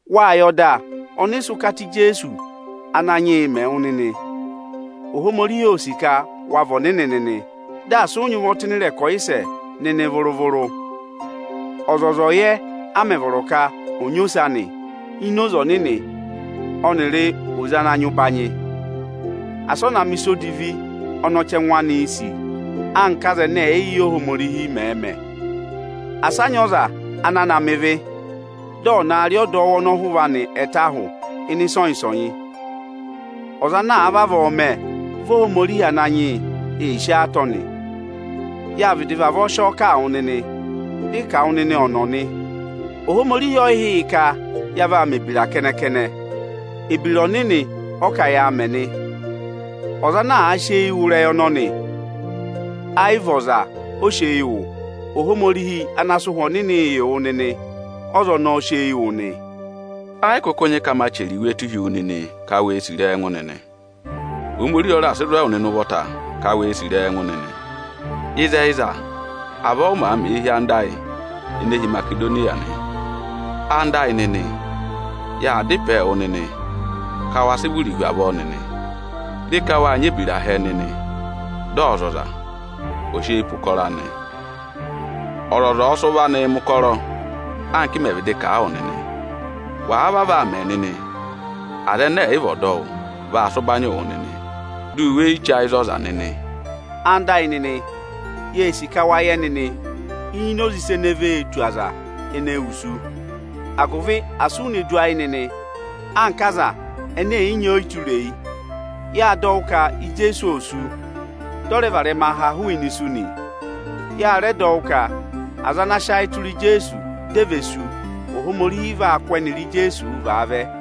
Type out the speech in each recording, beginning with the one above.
Wáa yẹ ọda ọnị ị sị ụkata Ijeesu Ananyị yị mẹ wụ nịnị. Ohomorihi óo sì ka wa vị ọnịnị nịnị, dị asị ụ nyị ụvọ tụ́ ịnị ịrẹkọyịsẹ nịnị vụrụ-vụrụ. Ọzọza ọ̀ yẹ, a mẹ̀ vọrọ ka ọ̀ nyị ose anị ini oze ọnịnị ọnịrị oze ana nyị ụbanyị; asị ọ na mẹ̀ ịsa odivi ọnị ọchẹngụ anịị̄ sì, anka aza ẹnẹ ẹ̀yị yẹ Ohomorihi mẹ̀ẹ̄ mẹ! Asị a nyị ọza ana na mẹ ịvị, dị ọ̀ na rị ọdọwụ ọnọhụva anị ẹtẹ ahụ ịnị ịsọnyị-ịsọnyị! Ọza ana àa vavọọ mẹ, vị Ohomorihi Ananyị yị ee sí ọọ atọ nị. Yáa vịdị vavọọ sị ọọ kà wụ nịnị, dị ị kà wụ nịnị ọ̀nọ̀ nị. Ohomorihi ọ yị hị́ yị ka ya vaa mẹ̀ ebira kẹnẹ-kẹnẹ; ebira ọnịnị ọ ka yaa mẹ nị. Ọza ana àa sị eyi wụ́ ịrẹyị ọnọnị, ayị vị ọza, ọ sị eyi wụ; Ohomorihi ana sị Ụhwẹ Ọnịnị yị wụ nịnị, ọ́za ọnọọ sị eyi wụ nị. Ẹ yị kụkụ nyị ka ma rẹẹ chẹrẹ iwee tụ́ụ hi wu nịnị ka wee sì ịrẹyị ẹngụ nịnị. Ohomorihi ọ raà sị zụ̀ ẹwụ nịnị ụvọta ka wee sì ịrẹyị ẹngụ nịnị. Ịzẹyịza, avọọ ụ màa mẹẹ hi anda ayị ene hi Imasedoniya nị. Ẹwụ nịnị ẹyịnyara amị, yaa dá ịpẹẹ wụ nịnị ka waa sịị vụrịị hu avọọ nịnị. Re ka wáa nyị ebira hẹẹ nịnị, dị ọzọza ò sị eyi pe ụkọrọ anị. Ọzọza ọ̀ọ sị ụvọ anịị mẹ̀ ụkọrọ anka ị mẹ̀ vịdị kà a wụ nịnị. Wàa vavọọ aa mẹ nịnị, aza ẹnẹ ẹ̀yị vị ọdọwụ vaa sị ụbanyịị wụ nịnị, di u weyi che ayị za ọza nịnị. Ẹwụ nịnị ẹyịnyara amị, yee sì ka wa yẹ nịnị ini oze ịsa ene vee tù aza ene wusu, agụvị asị u ne du ayị nịnị anka aza ẹnẹ ẹ̀yị nyị ọyịtureyi. Yáa dọ wụ́ ka Ijeesu ô sú, dị ọ rẹ varẹma ha hụụnị isu nị. Ya rẹ dọ wụ ka aza ana sị ayị tụra Ijeesu dị e vee sú, Ohomorihi vaa kụ́ ẹnịrị Ijeesuu vaa vẹ.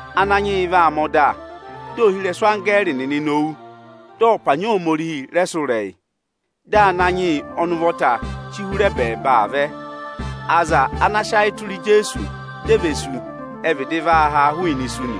Ananyị yị vaa mẹ̀ ọda, dị ohirẹsụ anggẹẹrị nịnị nowu, dị ọpanyị Ohomorihi rẹ sụ́ ịrẹyị, dị Ananyị yị ọnị ụvọta chí hụrẹ ẹbẹẹba aa vẹ. Aza ana sị ayị tụra Ijeesu dị e ve sú, ẹ vịdị vaa haa hụụnị isu nị.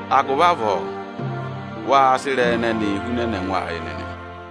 Agụvị avọọ, waa sị ịrẹyị ẹnẹnịị hunẹnẹ ẹngụ ayị nịnị.